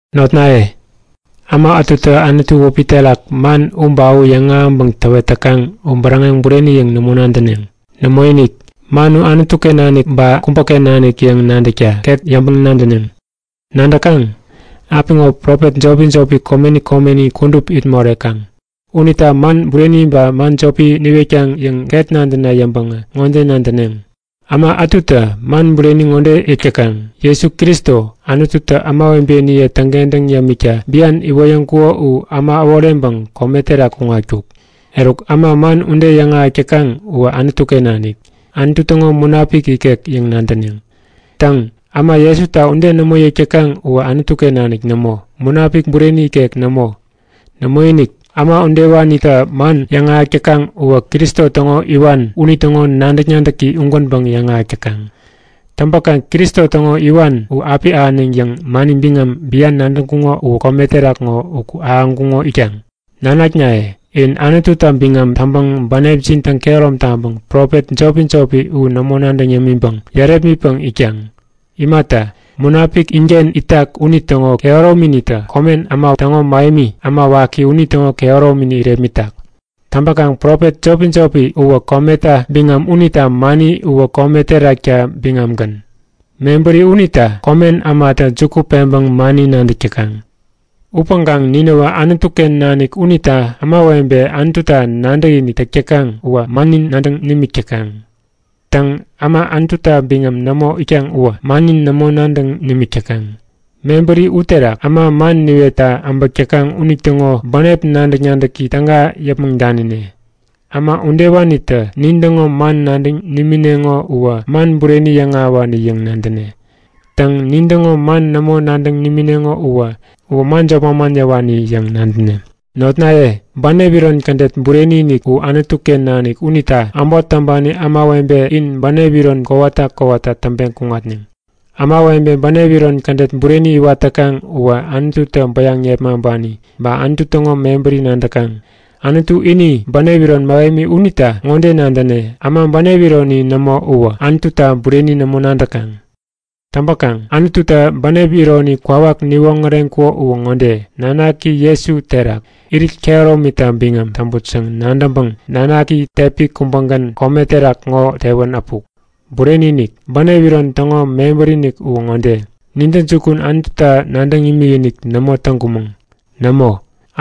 Notnaye, äma ätutä Anutu wäpi terak man u ba u yäŋahäŋpäŋ täwet täkaŋ u bäräŋeŋ bureni yäŋ nämo nadäneŋ. Nämoinik, man u Anutu-ken nanik ba kubäken nanik yäŋ nadäkta ket yäŋpäŋ-nadäneŋ. Nadäkaŋ? Apiŋo, profet jopi-jopi komeni komeni kudup it morekaŋ. Unita man bureni ba man jopi niwetkaŋ yäŋ ket nadäna yäŋpäŋä ŋode nadäneŋ; Äma ätutä man bureni ŋode yäk täkaŋ; Jesu Kristo, Anututä ämawebeniye täŋkentäŋ yämikta bian iwoyäŋkuko u äma äworeŋpäŋ kome terak kuŋatkuk. Eruk, äma man ude yäŋahäk täkaŋ uwä Anutu-ken nanik, Anutu täŋo Munapik ikek yäŋ nadäneŋ. Täŋ, äma Jesuta ude nämo yäk täkaŋ uwä Anutu-ken nanik nämo, Munapik bureni ikek nämo. Nämoinik, äma udewanitä man yäŋahäk täkaŋ uwä Kristo täŋo Iwan unitäŋo nadäk-nadäki ugänpäŋ yäŋahäk täkaŋ. Täŋpäkaŋ Kristo täŋo Iwan u api ahäneŋ yäŋ mani biŋam bian nadäŋkuŋo uwä kome terak ŋo uku ahäŋkuŋo itkaŋ. Nanaknaye, in Anututa biŋam täŋpäŋ bänepjin täŋkehärom taŋpäŋ profet jopi-jopi u nämo nadäŋ yämiŋpäŋ yärepmitpäŋ itkaŋ. Imata, Munapik inken itak unitäŋo kehärominitä komen äma täŋo mähemi, äma waki unitäŋo kehäromini irepmitak. Täŋpäkaŋ profet jopi-jopi uwä kometa biŋam unita mani uwä kome terakta biŋamgän. Mebäri unita komen ämatä juku peŋpäŋ mani nadäk täkaŋ. Upäŋkaŋ ninäwä Anutu-ken nanik unita ämawebe Anututa nadäkinik täk täkaŋ uwä mannin nadäŋ nimik täkaŋ. Täŋ, äma Anututa biŋam nämo itkaŋ uwä mannin nämo nadäŋ nimik täkaŋ. Mebäri uterak äma man niwetta äbäk täkaŋ unitäŋo bänep nadäk-nadäki täga yäpmäŋ danine. Äma udewanitä nintäŋo man nadäŋ nimineŋo uwä man bureni yäŋahäwani yäŋ nadäne. Täŋ, nintäŋo man nämo nadäŋ nimineŋo uwä man jop manman yäwani yäŋ nadäne. Notnaye, bänep iron kädet bureni-inik u Anutu-ken nanik unita äbot täŋpani ämawebe in bänep iron kowata kowata täŋpeŋ kuŋatneŋ. Ämawebe bänep iron kädet bureni iwat täkaŋ uwä Anututä bäyaŋ yepmaŋpani ba Anutu täŋo mebäri nadäkaŋ. Anutu ini bänep iron mähemi unita ŋode nadäne; Äma bänep ironi nämo uwä Anututa bureni nämo nadäkaŋ. Täŋpäkaŋ Anututä bänep ironi kwawak niwoŋäreŋkuko uwä ŋode; Nanaki Jesu uterak irit kehäromita biŋam täŋput yäŋ nadäŋpäŋ Nanaki tepi kubägän kome terak ŋo tewän äpuk. Bureni-inik, bänep iron täŋo mebäri-inik uwä ŋode; Nintäjukun Anututa nadäŋ imikinik nämo täŋkumäŋ. Nämo!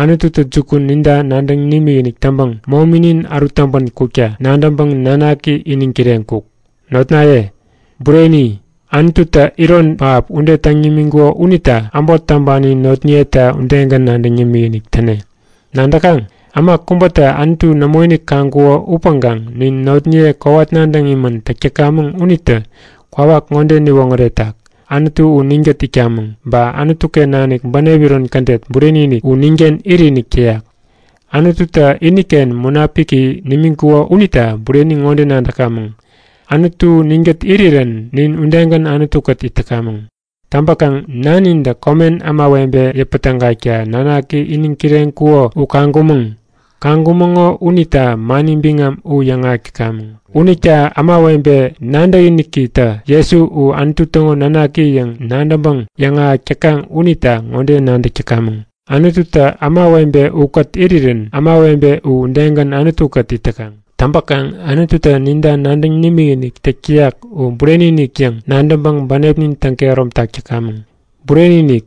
Anututä jukun ninta nadäŋ nimikinik täŋpäŋ mominin ärut täŋpän kukta nadäŋpäŋ Nanaki iniŋ kireŋkuk. Notnaye, bureni, Anututä iron pähap ude täŋ nimiŋkuko unita äbot täŋpani notniyeta udegän nadäŋ yämikinik täne. Nadäkaŋ? Äma kubätä Anutu nämoinik kaŋkuko upäŋkaŋ nin notniye kowat nadäŋ imän täk täkamäŋ unitä kwawak ŋode niwoŋäretak; Anutu u ninkät itkamäŋ, ba Anutu-ken nanik bänep iron kädet bureni-inik u ninken itinik täyak. Anututä iniken Munapiki nimiŋkuko uterak bureni ŋode nadäkamäŋ; Anutu ninkät irirän nin udegän Anutu-kät it täkamäŋ. Täŋpäkaŋ Nanintä komen ämawebe yäpätägakta Nanaki iniŋ kireŋkuko u kaŋkumäŋ. Kaŋkumäŋo unita mani biŋam u yäŋahäk täkamäŋ. Unita ämawebe nadäkinikitä Jesu u Anutu täŋo Nanaki yäŋ nadäŋpäŋ yäŋahäk täkaŋ unita ŋode nadäk täkamäŋ; Anututä ämawebe ukät irirän ämawebe u udegän Anutu-kät it täkaŋ. Täŋpäkaŋ Anututä ninta nadäŋ nimikinik täk täyak u bureni-inik yäŋ nadäŋpäŋ bänepnin täŋ-kehäromtak täkamäŋ. Bureni-inik,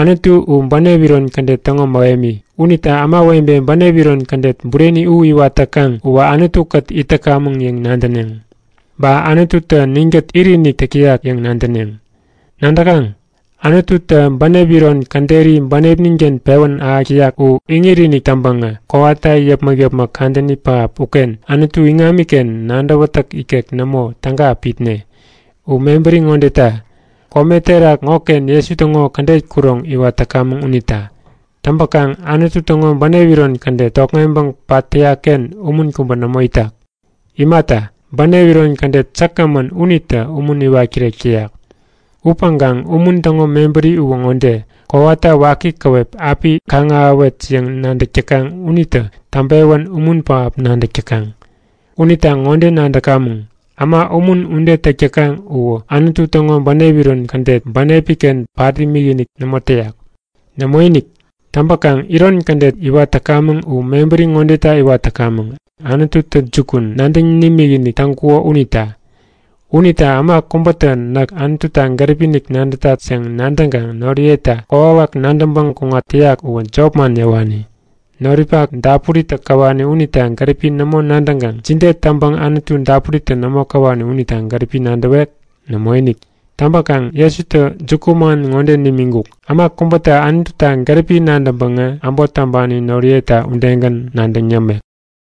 Anutu u bänep iron kädet täŋo mähemi. Unita ämawebe bänep iron kädet bureni u iwat täkaŋ uwä Anutu-kät it täkamäŋ yäŋ nadäneŋ. Ba Anututä ninkät itinik täk täyak yäŋ nadäneŋ. Nadäkaŋ? Anututä bänep iron käderi bänepnin-ken pewän ahäk täyak u iŋit-inik täŋpäŋä kowata yäpmäk-yäpmäk kadäni pähap uken Anutu iŋamiken nadäwätäk ikek nämo täga api itne. U mebäri ŋodeta; Kome terak ŋoken Jesu täŋo kädet kuroŋ iwat täkamäŋ unita. Täŋpäkaŋ Anutu täŋo bänep iron kädet tokŋeŋpäŋ pat täyak-ken umun kubä nämo itak. Imata, bänep iron kädet säkgämän unitä umun iwat kirek täyak. Upäŋkaŋ umun täŋo mebäri uwä ŋode; Kowata waki käwep api kaŋ-ahäwet yäŋ nadäk täkaŋ unitä täŋpewän umun pähap nadäk täkaŋ. Unita ŋode nadäkamäŋ; Äma umun ude täk täkaŋ uwä Anutu täŋo bänep iron kädet bänepi-ken pat imikinik nämo täyak. Nämoinik! Täŋpäkaŋ iron kädet iwat täkamäŋ u mebäri ŋodeta iwat täkamäŋ; Anututä jukun nadäŋ nimikinik täŋkuko unita. Unita äma kubätä Näk Anututa gäripi-inik nadätat yäŋ nadäŋkaŋ noriyeta kokwawak nadäŋpäŋ kuŋat täyak uwä jopman yäwani. Noripak dapuritä käwani unita gäripi nämo nadäŋkaŋ jide täŋpäŋ Anutu dapuritä nämo käwani unita gäripi nadäwek? Nämoinik! Täŋpäkaŋ Jesutä jukuman ŋode nimiŋkuk; Äma kubätä Anututa gäripi nadäŋpäŋä äbot täŋpani noriyeta udegän nadäŋ yämek.